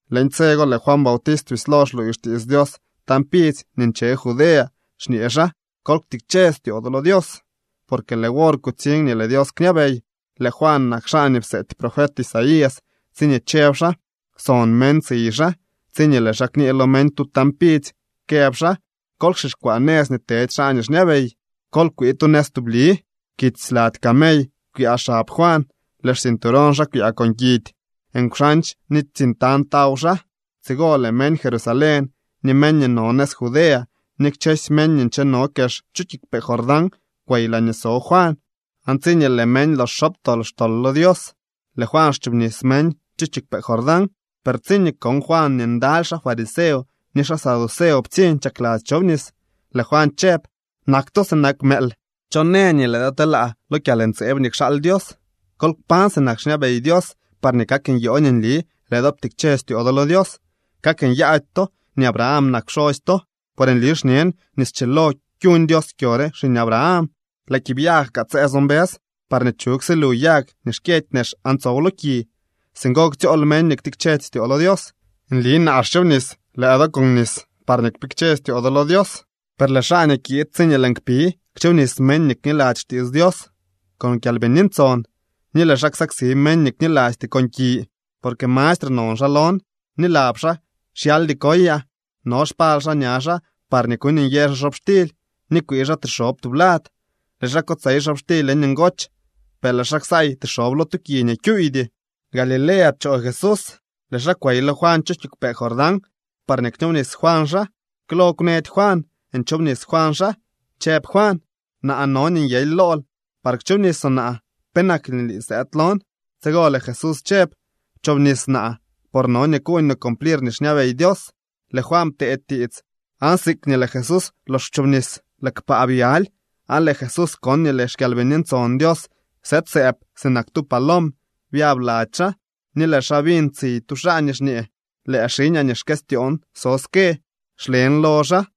Leñ tse go lëë Juan Bautist bislo xluuy xtiits Dios tañ pidzy nii nche Judea, xñee xaa: —Kol ktikche styoo do lo Dios, porque lëë wor kutsiñ nii lëë Dios kñabey. Lëë Juan nak xaa nii pseety profet Isaías tsiñee chëb xaa: Son meñ tsiy xaa tsiñee lëë xaa kñee lo meñ tu tañ pidzy këb xaa: “Kol kxixkwaa nëz nii tedy xaa nii xñabey. Kol kwii tu nëz tubli.” Kits lady camey kwyaa xab Juan, lëë xcinturón xaa kwyaa con kidy. Nkwxandx ni tsiñ tañ taw xaa. Tsigo lëë meñ Jerusalén, ni meñ nii no nëz Judea ni kchësy meñ nii ncheno kex chu kiigwpee Jordán kwey laañee so Juan. Aan tsiñee lëë meñ lox xobtol xtol lo Dios, lëë Juan xchoobnis meñ chu kiigwpee Jordán. Per tsiñee kon Juan nii ndaly xaa fariseo ni xaa saduceo ptsiñ chakladzy chobnis, lëë Juan chëb: —¡Nak to sinak mëël! ¿Cho në nii lëë do telaa lo kyalntseeb nii kxaal Dios? Kol kpañ sinak xñabey Dios parñee kak nyoo nii nli lëë do ptikche styoo do lo Dios. Kak nyaady to nii Abraham nak pxosy to. Por nli xñen nii schilo kyuñ Dios kyo re xiñ Abraham. Lëë kiibyag kaa tse so mbës parñee chug silu yag nii xkyëdy nex aan tsow lo ki. Singo ktsyool meñ nii xtikchedy styoo lo Dios. Nli naa xchoobnis lëë do con nis parñee kpikche styoo do lo Dios. Per lëë xaa nii kiid tsiñee lëën kpi kchoobnis meñ nii kniladzy xtiits Dios con Kyalbini Ntson, ni lëë xaa ksaksi meñ nii knilasty con ki. Porque mastre non xaa lon, ni lab xaa xyaldy koyaa. No xpal xaa ña xaa par kuuñnyë xaa xobxtily ni kwii xaa tixob tublad. Lëë xaa kotsey xobxtily leñ ngoch, per lëë xaa ksaay tixob lo tu ki nii kyuuydy. Galilea pchoo Jesús, lëë xaa kwey lo Juan chu kiigwpee Jordán parñee kchoobnis Juan xaa. Klo kwnëdy Juan nchoobnis Juan xaa, chëb Juan: —Naa no nii nyely lool par kchoobnisoo naa. ¿Penak nii lii sëëd lon? Tsigo lëë Jesús chëb: —Pchoobnis naa, por no nii kuuñ no cumplir nii xñabey Dios. Lëë Juan ptee tiits. Aan siikñee lëë Jesús lox kwchobnis, lëë kpaa byaly, aan lëë Jesús kon nii lëë xKyalbini Ntson Dios sëëd sëëb sinak tu palom byab lady xaa. Ni lëë xaa biñ tsiy tu xaa nii xñee: —Lëë xiñaa nii xkëstyoon so ske. Xlen lo xaa.